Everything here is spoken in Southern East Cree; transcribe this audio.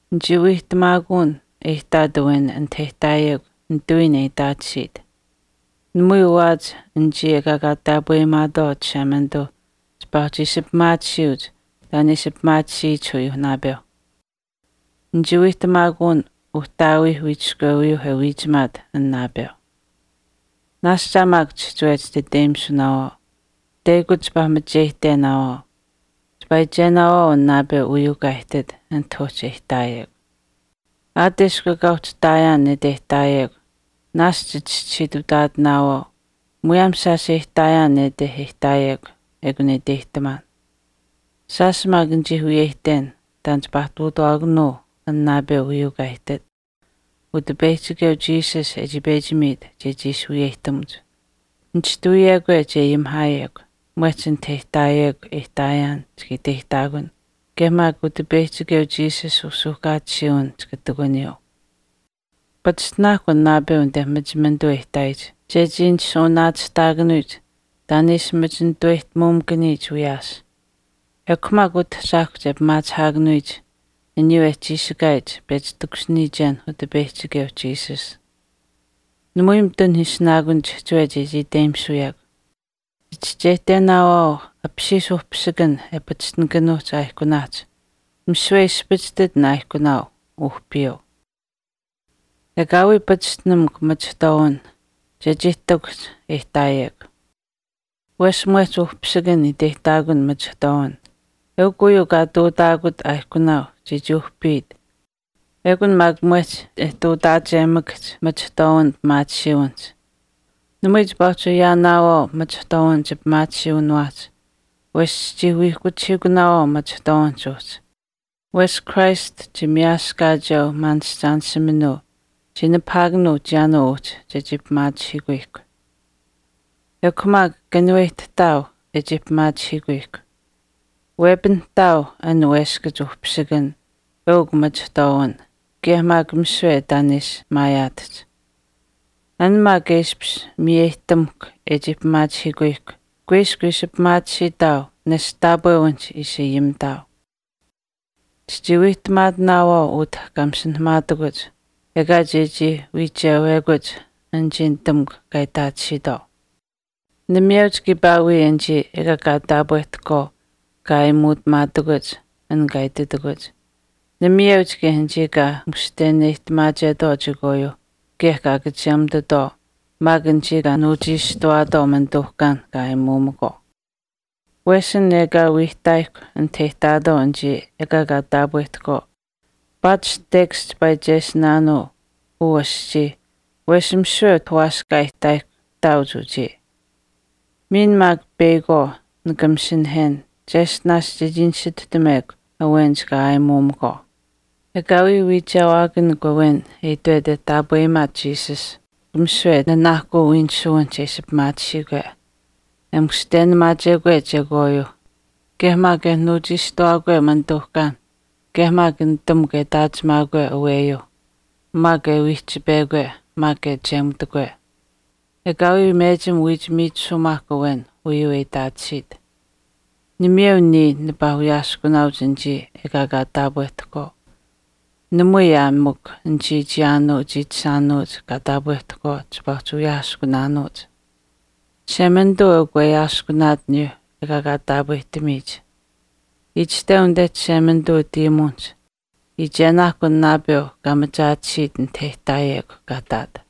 Nichii wiihtamaakun e ihtaat awen anit e ihtaayekw nitawiin e itaatisiit. Namui waawaach anichii ekaa kaa taapweyimaatwaau Chishemanituu chipaa uhchi ishi pimaatisiyuuch taan e ishi pimaatisiyich aniyuuh naapeuh. Nichii wiihtamaakun uhtaawiih wiichiskweuyuu e wiichimaat an naapeu. Naashch aa maak chihchiwe chititeyimisunaawaau. Teyakuch chipaa macheyihtenaawaau. Chipaa iichenaawaau an naapeu uyuu kaa ihtit anit uhchi e ihtaayekw. Aat eshkw ekaa ihtaayaan nete e ihtaayekw, naashch chichischisiitutaatinaawaau muyaam shaash e ihtaayaan nete e ihtaayekw ekun e iteyihtamaan. Shaash maak nichii wiyeyihten taan chipaa ihtuutawaakanuu an naapeu uyuu kaa ihtit, Utipeyihchikeu Jesus e chii pechi miit chechii ishi wiyeyihtamuch. Nishtuwiyekwe che ayimihaayekw, mwehch anit e ihtaayekw e ihtaayaan chika iteyihtaakun kaye maak Utipeyihchikeu Jesus usuuhkaatisiiwin chika ihtakuniyuu. Pachishtinaakw an naapeu anite machimanituu e ihtaayich chechii nishuuwanaachihtaakanuyich taan e ishi machi nituweyihtamuumakaniyich wiyaas. Ekw maak utahchaahkwa che pimaachihaakanuyich aniyuu e chiishikaayich pechi takushiniyichenh Utipeyihchikeuh Jesus. Namui mitun ishinaakun chihchiwe chechii iteyimisuyekw. Chichischeyihtenaawaau apishiish uhpisikan e pachishtinikanuuch aaihkunaahch misiwe e ispichishtit an aaihkunaau uhpiyuu. Ekaawii pachishtinamukw machihtwaawin chechii ihtakuhch anit e ihtaayekw. Wesh mwehch uhpisikan iteyihtaakun machihtwaawin, eukw uyuu kaa ihtuutaakut aaihkunaau chechii uhpiit ekun maak mwehch e ihtuutaachemakahch machihtwaawin pimaatisiiwinihch. Namui chipaa uhchi ayaanaawaau machihtwaawin chipimaatisiiwiniwaahch wesh chichii wiihkuchihiikunaawaau machihtwaawinihch uhchi. Wesh Christ chimiyaaskaacheu maanishchaanishiminuu chii nipahaakanuu chiyaanuu uhchi chechii pimaachihuyihkw. Ekw maak kanuweyihtahtaau e chii pimaachihiikuyihkw. Wepinihtaau an weskach uhpisikan eukw machihtwaawin kaye maak misiwe taan e ishi maayaatahch. An maak e ishpish miyeyihtamuhkw e chii pimaachihiikuyihkw kuiskw ishi pimaatisiitaau nesht taapwewinihch ishi ayimitaau. Chichii wiihtamaatinaawaau utah kaa masinahamaatakuch, ekaa chechii wiichewekuch anichii nitamukw kaa itaatisiitwaau. Namayeuch kiipaa wii anichii ekaa kaa taapwehtahkwaau kaa aayimuutamaatakuch an kaa ititakuch. Namayeuch kaye anichii kaa mushtenamaachetwaau chekwaayuuh kaye kaa kachemutitwaau maak anichii kaa nuuchiishtuwaatwaau manituuhkaan kaa aayimuumakwaau. Wesh an ekaa wii ihtaayihkw anit e itaatwaau anichii ekaa kaa taapwehtahkwaau, paatish tekash chipaa iichesinaanuu uu aschii wesh misiwe utah waaskaa e ihtaayihkw ihtaauch uchii. Miin maak peyakwaau nika masinahen cheshtinaash chechii nisituhtamekw awenich kaa aayimuumakwaau. Ekaawii wiichewaakanikw awen e itwet e taapweyimaat Jesus, misiwe nanaahkuu wiinisuwinihch e ishi pimaatisiikwe, e mushtenamaachekwe chekwaayuuh kaye maak e nuuchiishtuwaakwe manituuhkaanh kaye maak nitamukw e itaachimaakwe aweyuuh, maak e wiihchipekwe maak e wiihchi kechemutikwe. Ekaawii mechim wiich miichisumaahk awen uyuu e itaatisiit. Namayeu niya nipaa wiyaaskunaauch anichii ekaa kaa taapwehtahkwaau. Namui aa mikw anichii chiyaanuu chiichishaanuuch kaa taapwehtahkwaau chipaa uhchi wiyaaskunaanuuch. Chishemanituu eukw weyaaskunaat aniyuuh ekaa kaa taapwehtamiyich. Itashteu anite Chishemanituu utayimuwinihch, “Iichenaahkw an naapeu kaa machaatisiit anit e ihtaayekw kaa ihtaat.”